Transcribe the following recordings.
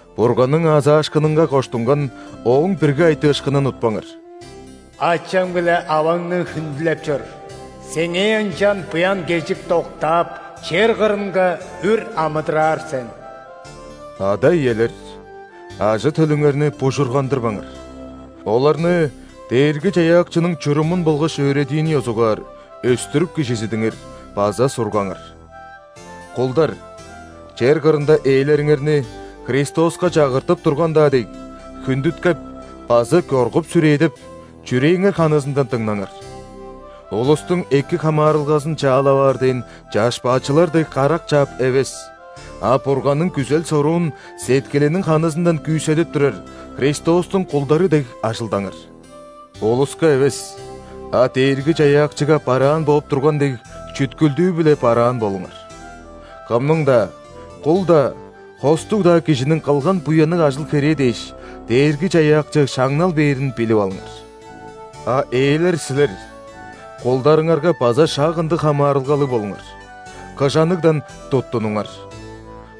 Бурганның аазаашкынынга коштунган Ооң бирги айтыышкынын утпаңар:«Ачаң биле аваңны хүндүлеп чор. Сеңээ ынчан буян-кежик доктаап,чер кырынга үр амыдыраар сен». Ада-иелер, ажы-төлүңерни бужургандырбаңар! Оларны Дээрги-Чаяакчының чурумун болгаш өөредиин ёзугаар өстүрүп-кижизидиңер база сургаңар. Кулдар, чер кырында ээлериңерни, Христоска чагыртып турган-даа дег, хүндүткеп база коргуп-сүрээдеп, чүрээңер ханызындан дыңнаңар. Улустуң эки хамаарылгазын чаалап аар дээн чашпаачылар дег, карак чаап эвес, а Бурганның күзел-соруун сеткилиниң ханызындан күүседип турар Христостуң кулдары дег ажылдаңар. Улуска эвес, а Дээрги-Чаяакчыга бараан бооп турган дег, чүткүлдүү-биле бараан болуңар. Кымның-даа: кул-даа, хостуг-даа кижиниң кылган буянныг ажыл-херээ дээш, Дээрги-Чаяакчы шаңнал бээрин билип алыңар. А ээлер силер, кулдарыңарга база шак ындыг хамаарылгалыг болуңар, кыжаныгдан туттунуңар.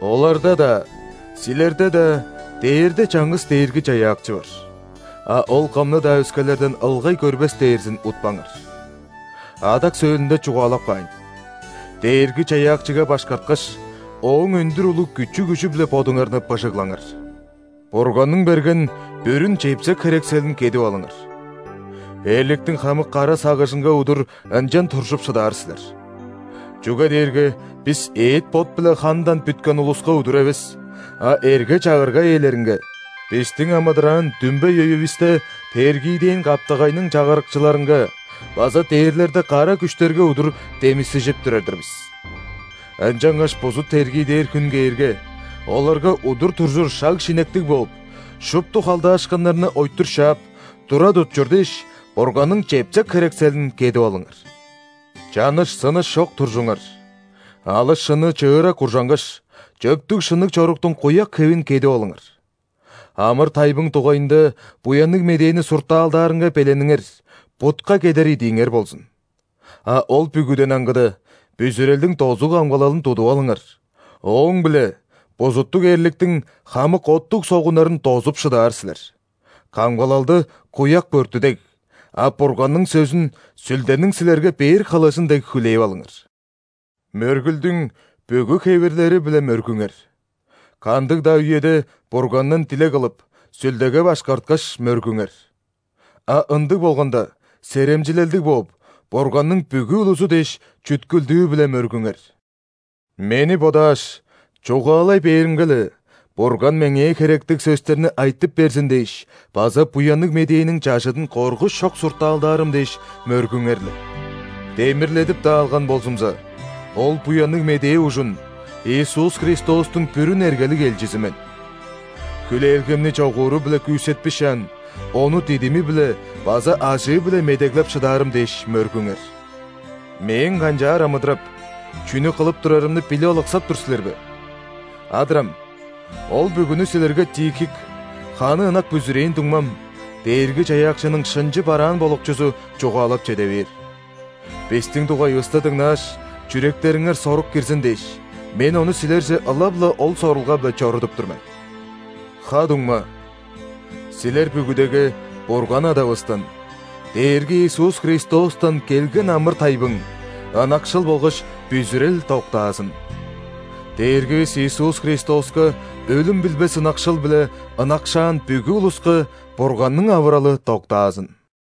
Оларда-даа, силерде-даа дээрде чаңгыс Дээрги-Чаяакчы бар, а Ол кымны-даа өскелерден ылгай көрбес дээрзин утпаңар. Адак сөөлүнде чугаалап каайн: Дээрги-Чаяакчыга башкарткаш, Ооң өндүр улуг күчү-күжү-биле бодуңарны быжыглаңар. Бурганның берген бүрүн чепсек-херекселин кедип алыңар, эрликтиң хамык кара сагыжынга удур ынчан туржуп шыдаар силер. Чүге дээрге бис эът-бот биле хандан бүткен улуска удур эвес, а эрге-чагырга ээлеринге, бистиң амыдыраан дүмбей үевисте тергиидээн каптагайның чагырыкчыларынга база дээрлерде кара күштерге удур демисежип турар-дыр бис. Ынчангаш бузут тергидээр хүн кээрге, оларга удур туржур шаг-шинектиг бооп, шупту халдаашкыннарны ойтур шаап, тура тутчур дээш, Бурганның чепсек-херекселин кедип алыңар. Чаныш-сыныш чок туржуңар! Алыс шынны чыыра куржангаш, чөптүг-шынныг чоруктуң куяк хевин кедип алыңар. Амыр-тайбың дугайында Буянныг Медээни суртаалдаарынга белениңер – бутка кедер идииңер болзун. А ол бүгүден аңгыда, бүзүрелдиң дозуг-камгалалын тудуп алыңар – ооң-биле бузуттуг эрликтиң хамык оттуг согуннарын дозуп шыдаар силер. Камгалалды – куяк бөрттү дег, а Бурганның сөзүн – Сүлдениң силерге бээр хылыжын дег хүлээп алыңар. Мөргүлдүң бүгү хевирлери-биле мөргүңер. Кандыг-даа үеде Бургандан дилег кылып, Сүлдеге башкарткаш, мөргүңер. А ындыг болганда, серемчилелдиг бооп, Бурганның бүгү улузу дээш, чүткүлдүү-биле мөргүңер. Мени бодааш – чугаалай бээримге-ле, Бурган меңээ херектиг сөстерни айтып берзин дээш база Буянныг Медээниң чажыдын коргуш чок суртаалдаарым дээш – мөргүңер-ле. Демирледип-даа алган болзумза, ол Буянныг Медээ ужун Иисус Христостуң бүрүн эргелиг элчизи мен. Хүлээлгемни чогууру-биле күүсетпишаан, ону дидими-биле база ажыы-биле медеглеп шыдаарым дээш мөргүңер. Мээң канчаар амыдырап, чүнү кылып турарымны билип алыксап тур силер бе? Адырам, ол бүгүнү силерге Тихик, ханы ынак бүзүрээн дуңмам, Дээрги-Чаяакчының шынчы бараан болукчузу, чугаалап чеде бээр. Бистиң дугайывыста дыңнааш, чүректериңер сорук кирзин дээш, мен ону силерже ылап-ла ол сорулга-биле чорудуп тур мен. Ха-дуңма, силер бүгүдеге Бурган Адавыстан, Дээрги Иисус Христостан келген амыр-тайбың, ынакшыл болгаш бүзүрел доктаазын! Дээргивис Иисус Христоска өлүм билбес ынакшыл-биле ынакшаан бүгү улуска Бурганның авыралы доктаазын!